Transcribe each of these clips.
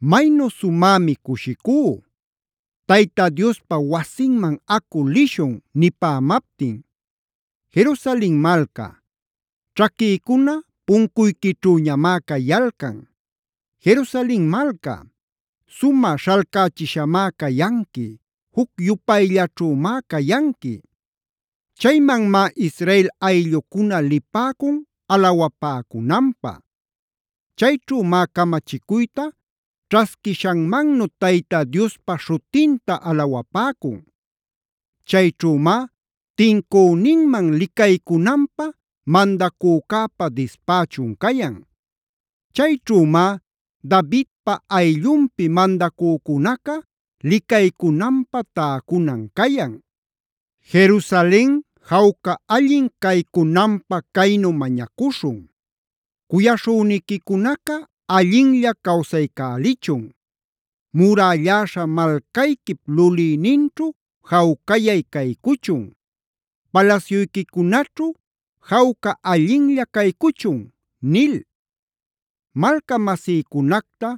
Maynu sumämi cushicú: “Tayta Diospa wasinman acu lishun” nipämaptin. Jerusalen malca, ćhaquïcuna puncuyquićhüñamá cayalcan. Jerusalen malca, sumä śhalcächishamá cayanqui, juc-yupayllaćhümá cayanqui. Chaymanmá Israel ayllucuna lipäcun alawapäcunanpä. Chayćhümá camachicuyta ćhasquishanmannu Tayta Diospa śhutinta alawapäcun. Chayćhümá tincüninman licaycunanpä mandacücäpa dispächun cayan. Chayćhümá Davidpa ayllunpi mandacücunaca licaycunanpä täcunan cayan. Jerusalen jawca allin caycunanpä caynu mañacuśhun: “Cuyaśhüniquicunaca allinlla cawsaycälichun. Murälläśha malcayquip lulïninćhu jawcayay caycuchun. Palasyuyquicunaćhu jawca allinlla caycuchun” nil. Malcamasïcunacta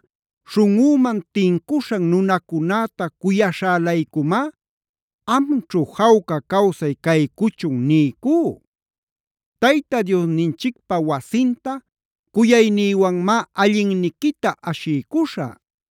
śhunꞌüman tincuśhan nunacunäta cuyaśhä-laycumá: “Amćhu, jawca cawsay caycuchun” niycú. Tayta Diosninchicpäwasinta cuyaynïwanmá allinniquita ashiycuśhä.